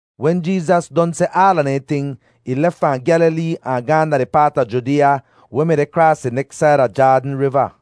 Wen Jeezas don seh aala dehn ting, ih lef fahn Gyalilee ahn gaahn da di paat a Judeeya weh mi deh kraas di neks said a Jaadn Riva.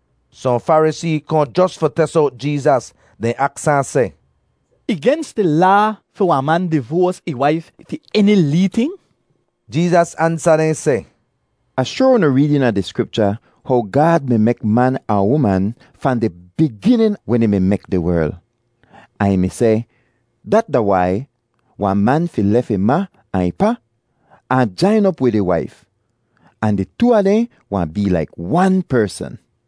Sohn Farisee kohn jos fi tes owt Jeezas. Dehn aks ahn seh, “Ih gens di Laa fi wahn man divoas ih waif fi eni lee ting?” Jeezas ansa dehn seh, “Ah shoar unu reed eena di Skripcha how ‘Gaad mi mek man ahn uman’ fahn di biginin wen ih mi mek di werl, ahn ih mi seh, ‘Dat da wai wahn man fi lef ih ma ahn ih pa ahn jain op wid ih waif, ahn di too a dehn wahn bee laik wan persn.’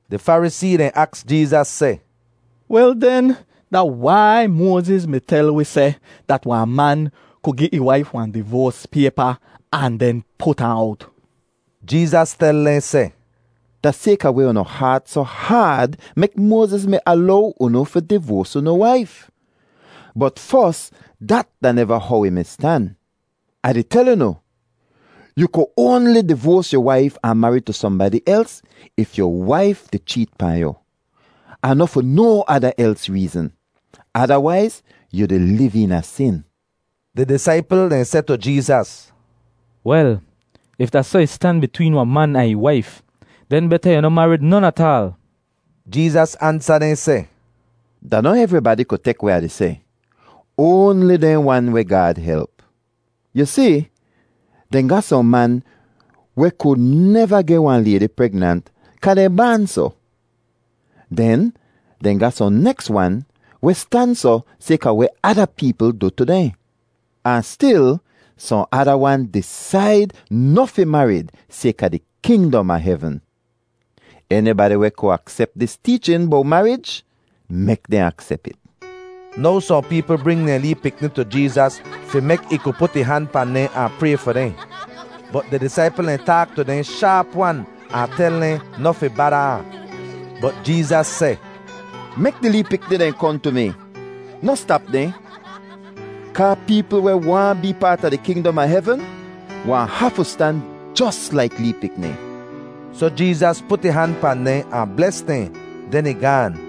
Di Farisee dehn aks Jeezas seh, “Wel den, da wai Moaziz mi tel wi seh dat wahn man ku gi ih waif wahn divoas paypa ahn den put ahn owt?” Jeezas tel dehn seh, “Da sayka weh unu haat soh haad mek Moaziz mi alow unu fi divoas unu waif. Bot fos dat da neva how ih mi stan. Ah di tel unu, yu ku oanli divoas yu waif ahn marid tu sohnbadi els if yu waif di cheet pahn yu, ahn noh fi no ada els reezn; adawaiz yu di liv eena sin.” Di disaipl dehn seh tu Jeezas, “Wel, if da soh ih stan bitween wahn man ahn ih waif, den beta yu noh marid non ataal.” Jeezas ansa dehn seh, “Da noh evribadi ku tek weh Ah di seh, oanli dehn wan weh Gaad help. Yu si, dehn ga sohn man weh ku neva geh wahn laydi pregnant kaa dehn baan soh. Den dehn ga sohn neks wan weh stan soh sayka weh ada peepl du tu dehn. Ahn stil sohn ada wan disaid noh fi marid sayka di kingdom a hevn. Enibadi weh ku aksep dis teechin bowt marij, mek dehn aksep it.” Now sohn peepl bring dehn lee pikni tu Jeezas fi mek ih ku put ih han pahn dehn ahn pray fi dehn. Bot di disaipl dehn taak tu dehn shaap-wan ahn tel dehn noh fi bada ahn. Bot Jeezas seh, “Mek di lee pikni dehn kohn tu mi. Noh stap dehn, kaa peepl weh waahn bee paat a di kingdom a hevn wahn hafu stan jos laik lee pikni.” Soh Jeezas put ih han pahn dehn ahn bles dehn, den ih gaan.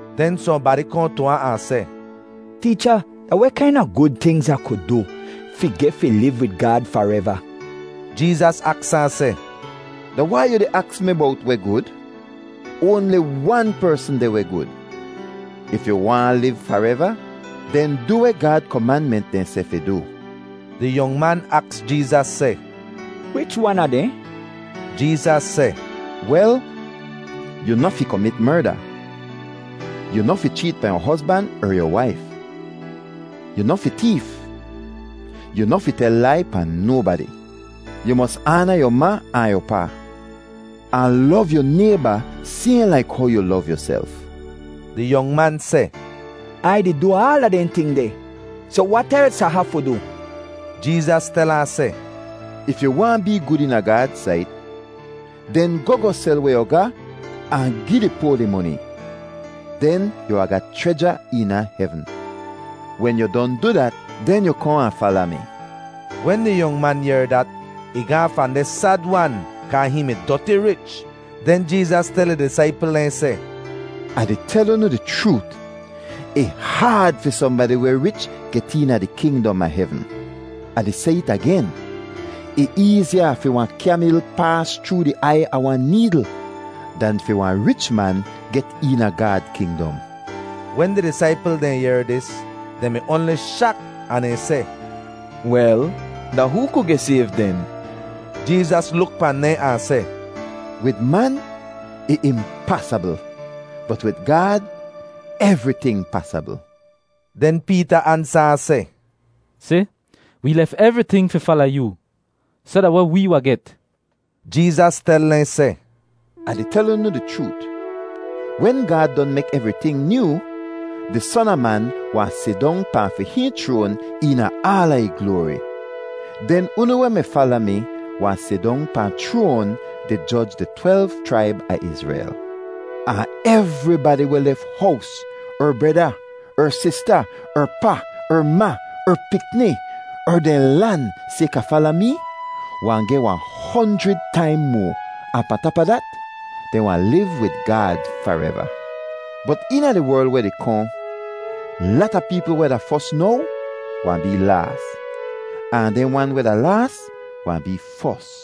Den sohnbadi kohn tu ahn, ahn seh, “Teecha, da weh kaina gud tingz Ah ku du fi geh fi liv wid Gaad fareva?” Jeezas aks ahn seh, “Da wai yu di aks mi bowt weh gud? Oanli wan persn deh weh gud. If yu waahn liv fareva, den du weh Gaad komanment dehn seh fi du.” Di yong man aks Jeezas seh, “Wich wan a dehn?” Jeezas seh, “Wel, ‘yu noh fi komit merda, yu noh fi cheet pahn yu hozban er yu waif, yu noh fi teef, yu noh fi tel lai pahn nobadi. Yu mos aana yu ma ahn yu pa,’ ahn ‘lov yu nayba sayhn laik how yu lov yuself.’” Di yong man seh, “Ai di du aala dehn ting deh. Soh wat els Ah hafu du?” Jeezas tel ahn seh, “If yu waahn bee gud eena Gaad sait, den goh goh sel weh yu ga ahn gi di poa di moni, den yu wahn ga chreja eena hevn. Wen yu don du dat, den yu kohn ahn fala mi.” Wen di yong man yehr dat, ih gaahn fahn deh sad-wan kaa hihn mi doti rich. Den Jeezas tel ih disaipl dehn seh, “Ah di tel unu di chroot, ih haad fi sohnbadi weh rich get eena di kingdom a hevn. Ah di seh it agen, ih eeziya fi wahn kyamil paas chroo di aiy a wahn needl dan fi wahn rich man get eena Gaad kingdom.” Wen di disaipl dehn yehr dis, dehn mi oanli shak ahn dehn seh, “Wel, da hoo ku geh sayv den?” Jeezas luk pahn dehn ahn seh, “Wid man, ih impasabl. Bot wid Gaad, evriting pasabl.” Den Peeta ansa ahn seh, “Si, wee lef evriting fi fala yoo. Soh da weh wee wahn get?” Jeezas tel dehn seh, “Ah di tel unu di chroot, wen Gaad don mek evriting nyoo, di Son a Man wahn sidong pahn fi hihn chroan eena aala ih gloari. Den unu weh mi fala mi wahn sidong pahn chroan, di joj di twelv chraib a Izrel. Ahn evribadi weh lef hows, er breda, er sista, er pa, er ma, er pikni, er dehn lan sayka fala mee, wahn geh wahn honjrid taim moa, ahn pahn tap a dat, dehn wahn liv wid Gaad fareva. Bot eena di werl weh di kohn, lata peepl weh da fos now wahn bee laas, ahn dehn wan weh da laas wahn bee fos.”